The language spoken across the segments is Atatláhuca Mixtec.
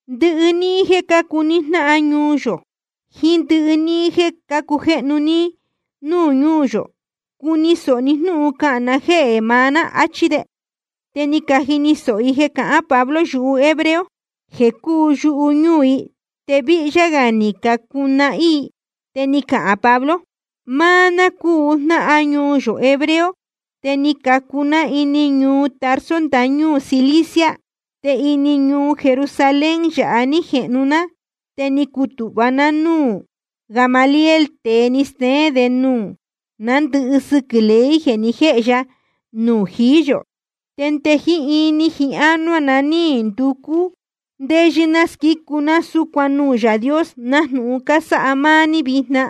Ndɨhɨ níhín jeē cácuu ní jnáhan ñuu yō jiín ndɨhɨ níhín jeē cácujéhnu ní núū ñúū yō, cuni sōho ní jnúhun cahān na jéhē maá ná, achí de. Te ni cajini sōho i jeē cahán Pablo yuhu hebreo jeē cúu yuhu ñúū i, te víhyá gā ni cacunahín i. Te ni cahān Pablo: Máá ná cúu jnáhan ñuu yō hebreo, te ni cacu ná ini ñuu Tarso ndañúū Cilicia. Te ini ñuu Jerusalén yāha ní jehnu ná, te ni cutūhva ná núū Gamaliel, te ni steén de nuū ná ndɨhɨ sɨquɨ̄ ley jeē ni jéhe ya nuū jií yō. Te nde jiín ini jiín ánuá na ní nducú ndéyɨ́ ná squícu ná súcuan nuū Yaā Dios, nájnūhun cásáha máá ní vijna.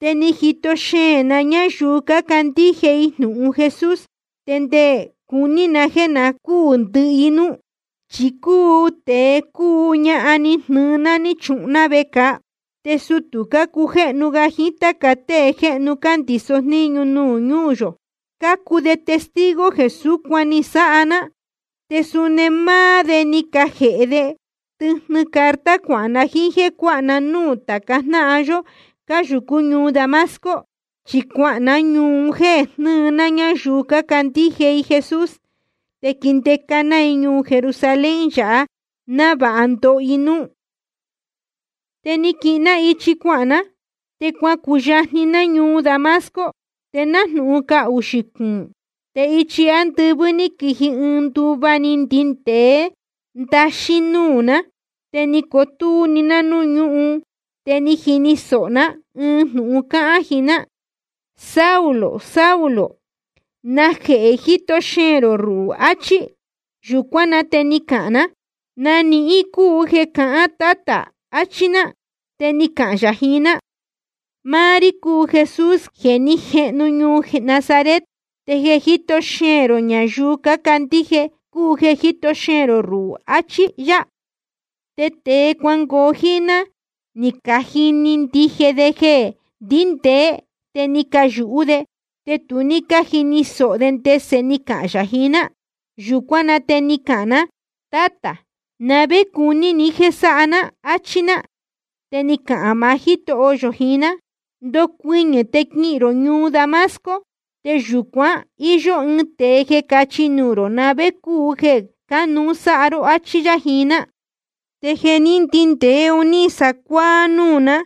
Te ni jito xeēn na ñáyuu cácandíje i jnūhun Jesús te nde cuní na jéē na cúū ndɨhɨ i núú. Chi cúu tēe cúu ñahan ni jnɨɨ ná ni chuhun ná vecāa. Te sutū cujéhnu ga jiín táca tée jéhnu cándīso jníñu nuū ñúū yō, cácuu de testigo jeē súcuan ni sáha ná, te suni máá de ni cajēhe de tɨjnɨ carta cuahān na jíín jéē cuáha na núū tāca jnáhan yó cáyūcú ñuu Damasco. Chi cuahān ná ñuu un jéē jnɨɨ ná ñáyuu cácandíje i Jesús te quindeca ná i ñuu Jerusalén yāha, návāha ndoho i núú. ’Te ni quihin ná ichi cuahān ná, te cuacuyajni ná ñuu Damasco, te nájnūhun caxū cúu. Te ichi ándɨvɨ́ ní quiji ɨɨn nduva ní ndindēé ndaxín núū ná. Te ni cotúú‑ni ná núū ñúhun, te ni jini sōho ná ɨɨn jnūhun cáhán jiín ná: Saulo, Saulo, ¿najehē jíto xeēn rō ruhū? achí. Yūcuán na te ni cahān ná: ¿Na nihín cúu jeē cahán, Tátā? achí ná. Te ni cahān yā jiín ná: Máá rí cúu Jesús jeē ní jehnu ñuu Nazaret, te jeē jíto xeēn rō ñayuu cácandíje i ruhū cúu jeē jíto xeēn rō ruhū, achí yá. Te tēe cuangoo jíín ná ni cajini ndije de jeē ndíndēé, te ni cayūhú de, te tu ní cájini sōho de ndese ni cahān yā jiín ná. Yūcuán na te ni cahān ná: Tátā, ¿na vé cuní ni jéē sáha ná? áchí ná. Te ni cahān maá Jítoho yō jiín ná: Ndocuɨñɨ̄ te quihīn rō ñuu Damasco, te yūcuan íyó ɨɨn tēe jeē cachi nuū rō na vé cúu jeē cánuú sáha ró, áchí yá jiín ná. Te jeē ní ndindēé un ní sacuáá núū ná,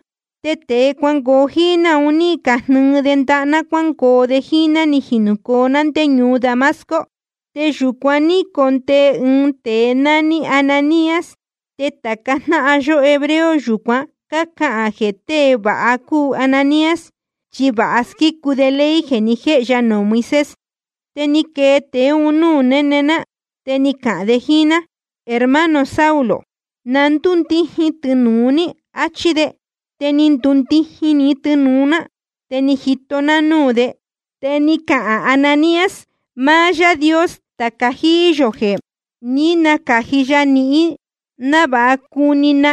te tēe cuangoo jíín ná un ní cajnɨɨ de ndaha ná cuángoo de jíín ná ní jinūcoo ná ndé ñuu Damasco. ’Te yūcuan ní condee ɨɨn tēe nání Ananías, te tāca jnáhan yó hebreo yūcuan cácahān jeē tée vāha cúu Ananías, chi vāha squícu de ley jeē ni jéhe ya nuū Moisés. Te ni quee tēe un núū néne ná, te ni cahān de jíín ná: Hermano Saulo, na ndúndijin tɨnūu ní, achí de. Te ni ndundijin‑ni tɨnūu ná, te ni jito ná núū de. Te ni cahān Ananías: Máá Yáā Dios tāca jíí yō, je ni nacāji ya nihín návāha cuni ní na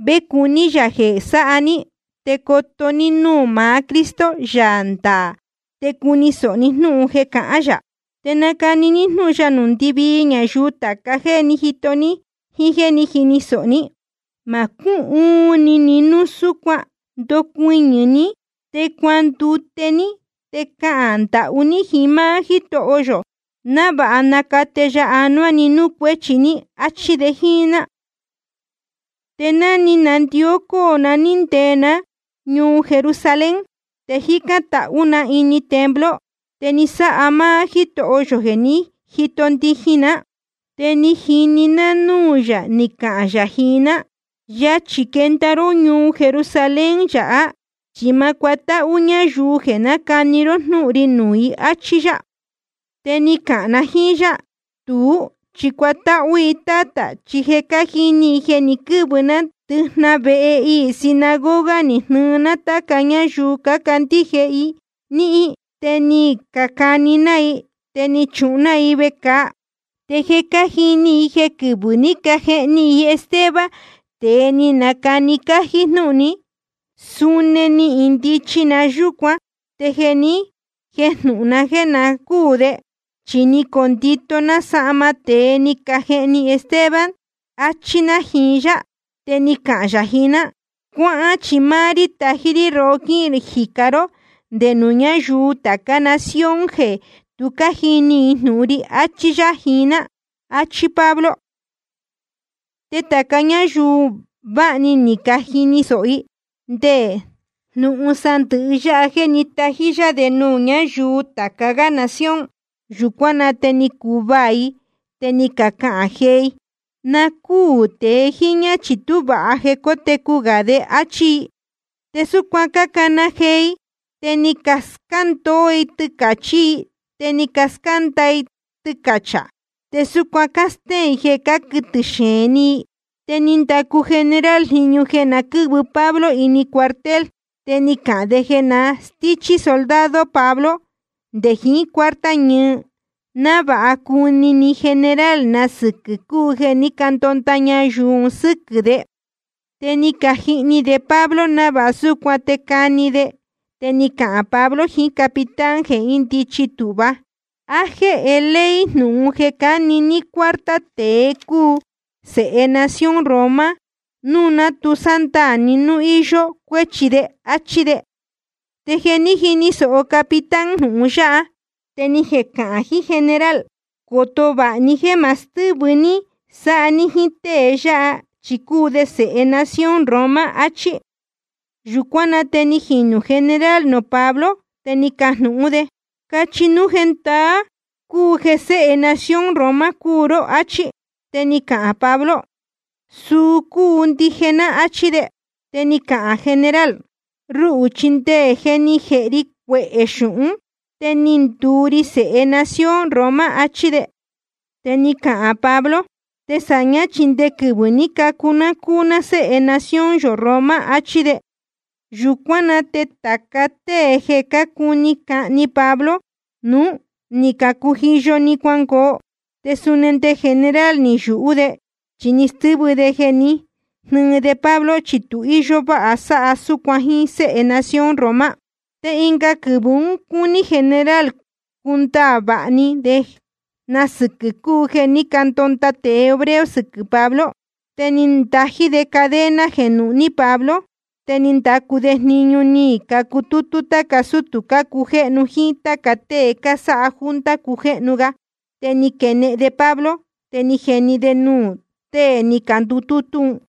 vé cuní yā jeē sáha ní, te coto ní núū maá Cristo, Yaā ndaā, te cuni sōho ni jnúhun jeē cahán yā. Te nacani ní jnúhun ya nuū ndɨvii ñayuu tāca jéē ní jito ní jíín jéē ní jini sōho ní. Ma cúhuun ni ni núu súcuan. Ndocuɨñɨ̄ ní, te cuandute ní te cahān ndahú ní jiín máá Jítoho yō, návāha nacate ya anuá ni núū cuéchi, áchí de jíín ná. ’Te ni nandió cóo na ní ndee ná ñuu Jerusalén. Te jícán tahú na ini templo, te ni sáha máá Jítoho yō jeē ní jito ndijin ná. Te ni jini na núū yā ni cahān yā jiín ná: Yachī quenda ró ñuu Jerusalén yāhá, chi ma cuatáhú ñáyuu yáha jéē nácani ró jnúhun ri nuū i, áchí yá. Te ni cahān na jíín yá: Tuú, chi cuatáhú i, Tátā, chi je cájini i jeē ni quɨ́vɨ ná ndɨjnahan vehe iī sinagoga ni jnɨɨ ná táca ñáyuu cácandíje i níhín, te ni cani ná i, te ni chuhun ná i vecāa. Te je cájini i jeē quɨvɨ̄ ní cajehni i Esteban, tēe ni nacani cájí jnúhun ní, suni ni indichi na yúcuan, te ni jejnúhún ná jeē na cúū de, chi ni condito ná sahma tēe ni cajehni Esteban, áchí ná jiín yá. Te ni cahān yā jiín ná: Cuáhán, chi máá rí tají rí rohó quíhīn jicá ró nde nuū ñáyuu tācá nación jeē tu cájini i jnūhun ri, achí yá jiín ná. Achí Pablo. Te tāca ñáyuu ún vāha‑ni ni cajini sōho i te nde jnūhun sandɨ̄hɨ yáha jéē ní tají yá de nuū ñáyuu tāca gá nación. Yūcuán na te ni cacuvaā i, te ni cacahān jee i: Na cúū tēe jíñá, chi tú vāha jeē cótecu gā de, áchí i. Te súcuan cácana jee i, te ni cascándoó i tɨcāchí i, te ni cascánda i tɨcachā. Te súcuan cástéén i jeē cáquɨtɨ̄ xeēn ni i. Te ni ndacu general jniñu jeē na quɨ́vɨ Pablo ini cuartel, te ni cahān de jeē na stíchí soldado Pablo nde jiín cuarta ñɨɨ, návāha cujnúní ni general na sɨquɨ̄ cúu jeē ní candonda ñayuu un sɨ́quɨ̄ de. Te ni cajihni de Pablo návāha súcuan te cani de. Te ni cahān Pablo jiín capitán jeē índichi tūhva: ¿A jéhe ley jnūhun jeē cani ní cuarta tēe cúu sēhe nación Roma núu ná tu sándaā ní núu íyó cuéchi de? áchí de. Te ni jini sōho capitán jnūhun yáha, te ni jecahān jiín general: Coto vāha ní jéē ma stɨ́vɨ ní sáha ní jíín tée yáha, chi cúu de sēhe nación Roma, achí. Yūcuán na te ni jinū general nuū Pablo, te ni cajnūhún de: Cachi núu jendaá cúu jeē séhe nación Roma cúu ró, áchí. Te ni cahān Pablo: Suu cúu ndije ná, áchí de. Te ni cahān general: Ruhū chi nde jeē ni jéhe ri cuehē xūhún te ni nduu ri sēhe nación Roma, áchí. Te ni cahān Pablo: Te sāñá chi nde quɨvɨ̄ ní cacu ná cúu ná séhe nación yō Roma, achí de. Yūcuán na te tāca tée jeē cácuni cani Pablo nuú, ni cacujiyo‑ni cuangoo, te suni nde general ni yūhú de, chi ni stɨ́vɨ de jeē ní jihni de Pablo, chi tu íyó váha sáha súcuan jíín séhe nación Roma. Te ɨnga quɨvɨ̄ un cúní general cundaā vāha ni de na sɨquɨ̄ cúu jeē ní candonda tēe hebreo sɨquɨ̄ Pablo. Te ni ndají de cadena jeē nuhní Pablo, te ni ndacu de jniñu ni cacutútú táca sútū cácujéhnu jíín táca tée cásáha junta cujéhnu ga, te ni quenehen de Pablo, te ni jeni de nuū tée ni candutútú un.